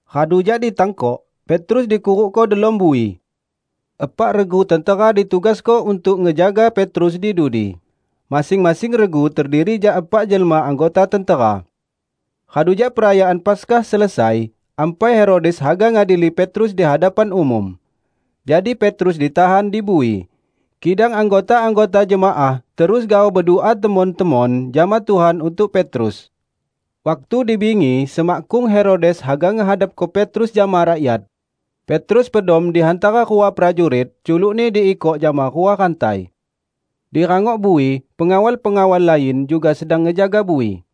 Radu jak ditangkok, Petrus dikurukko delom bui. Epak regu tentera ditugasko untuk ngejaga Petrus di dudi -- masing-masing regu terdiri jak epak jelma anggota tentera. Radu jak perayaan Paskah selesai, ampai Herodes haga ngadili Petrus di hadapan umum. Jadi Petrus ditahan di bui; kidang anggota-anggota jemaah terus gaoh bedua temon-temon jama Tuhan untuk Petrus. Waktu di bingi semakkung Herodes haga ngehadapko Petrus jama rakyat, Petrus pedom di hantara rua prajurit culukni diikok jama rua rantai. Di rangok bui, pengawal-pengawal lain juga sedang ngejaga bui.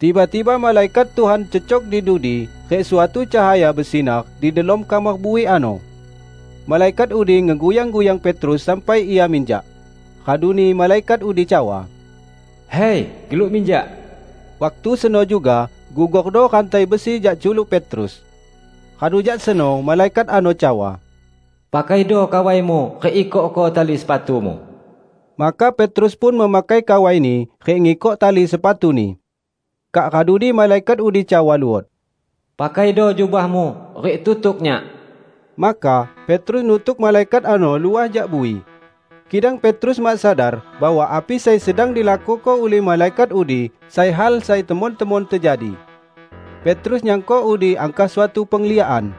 Tiba-tiba malaikat Tuhan cecok di dudi rik suatu cahaya besinar di delom kamar bui ano. Malaikat udi ngeguyang-guyang Petrus sampai ia minjak. Raduni malaikat udi cawa, "Hai, geluk minjak!" Waktu seno juga gugordo rantai besi jak culuk Petrus. Radu jak seno malaikat ano cawa, "Pakaido kawaimu rik ikokko tali sepatumu." Maka Petrus pun memakai kawaini rik ngikok tali sepatuni. Kak raduni malaikat udi cawa luot, "Pakaido jubahmu rik tutuk nyak." Maka Petrus nutuk malaikat ano luah jak bui. Kidang Petrus mak sadar bahwa api sai sedang dilakuko ulih malaikat udi sai hal sai temon-temon tejadi. Petrus nyangko udi angkah suatu pengliakan.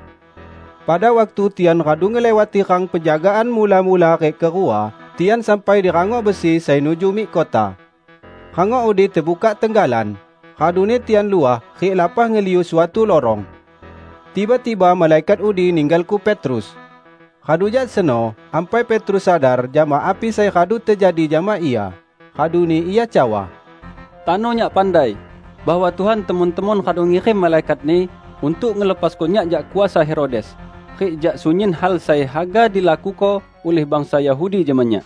Pada waktu tian radu ngeliwati rang penjagaan mula-mula rik kerua, tian sampai di rangok besi, sai nuju mik kota. Rangok udi tebukak tenggalan, raduni tian luah rik lapah ngeliu suatu lorong. Tiba-tiba malaikat udi ninggalko Petrus. Radu jak seno ampai Petrus sadar jama api sai radu tejadi jama ia, raduni ia cawa, "Tano nyak pandai bahwa Tuhan temon-temon radu ngirim malaikat-Ni untuk ngelepasko nyak jak kuasa Herodes rik jak sunyin hal sai haga dilakuko ulih bangsa Yahudi jama nyak."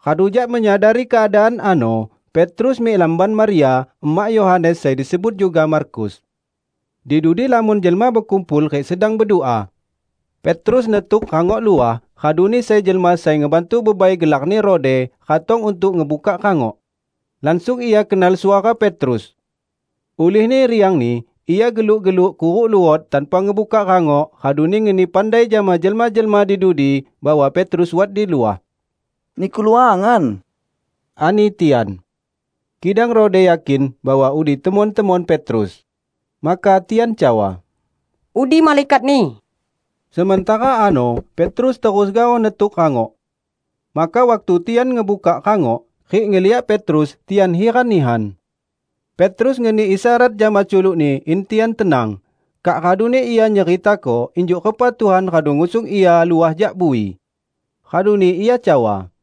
Radu jak menyadari keadaan ano, Petrus mik lamban Maria, emak Yohanes sai disebut juga Markus. Di dudi lamon jelma bekumpul rik sedang bedua. Petrus netuk rangok luah, raduni sai jelma sai ngebantu bebai gelarni Rode, ratong untuk ngebukak rangok. Langsung ia kenal suara Petrus. Ulihni riangni, ia geluk-geluk kuruk luot tanpa ngebukak rangok, raduni ngeni pandai jama jelma-jelma di dudi bahwa Petrus wat di luah. "Niku luangan!" ani tian. Kidang Rode yakin bahwa udi temon-temon Petrus. Maka tian cawa, "Udi malaikatni!" Sementara ano Petrus terus gaoh netuk rangok. Maka waktu tian ngebukak rangok, rik ngeliak Petrus, tian hiran nihan. Petrus ngeni isyarat jama culukni in tian tenang, kak raduni ia nyeritako injuk repa Tuhan radu ngusung ia luah jak bui. Raduni ia cawa,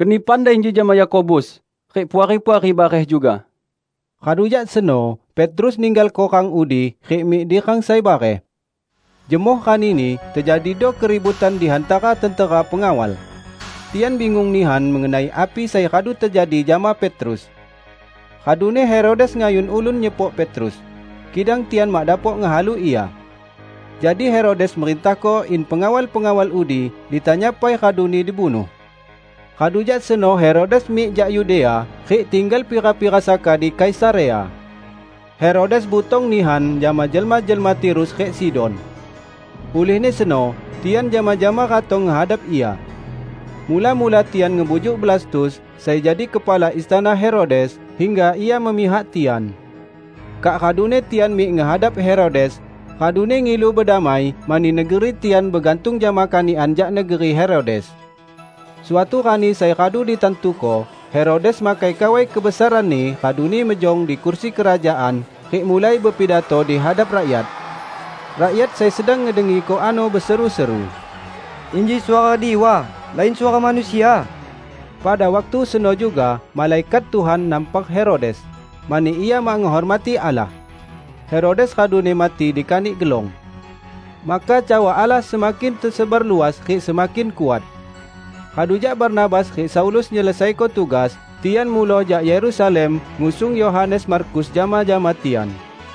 "Keni pandai inji jama Yakobus rik puari-puari bareh juga." Radu jak seno Petrus ninggalko rang udi rik mik di rang sai bareh. Jemoh ranini tejadido keributan di hantara tentera pengawal. Tian bingung nihan mengenai api sai radu tejadi jama Petrus. Raduni Herodes ngayun ulun nyepok Petrus, kidang tian mak dapok ngehalu ia. Jadi Herodes merintahko in pengawal-pengawal udi ditanya pai raduni dibunuh. Radu jak seno Herodes mik jak Yudea rik tinggal pira-pira saka di Kaisarea. Herodes butong nihan jama jelma-jelma Tirus rik Sidon. Ulihni seno tian jama-jama ratong ngehadap ia. Mula-mula tian ngebujuk Blastus, sai jadi kepala istana Herodes, hingga ia memihak tian. Kak raduni tian mik ngehadap Herodes, raduni ngilu bedamai, mani negeri tian begantung jama kanikan jak negeri Herodes. Suatu rani sai radu ditantuko, Herodes makai kawai kebesaranni raduni mejong di kursi kerajaan rik mulai bepidato di hadap rakyat. Rakyat sai sedang ngedengiko ano beseru-seru, "Inji suara diwa, lain suara manusia!" Pada waktu seno juga malaikat Tuhan nampar Herodes, mani ia mak ngehormati Allah. Herodes raduni mati dikanik gelong. Maka cawa Allah semakin tesebar luas rik semakin kuat. Radu jak Barnabas rik Saulus nyelesaiko tugas, tian muloh jak Yerusalem ngusung Yohanes Markus jama-jama tian.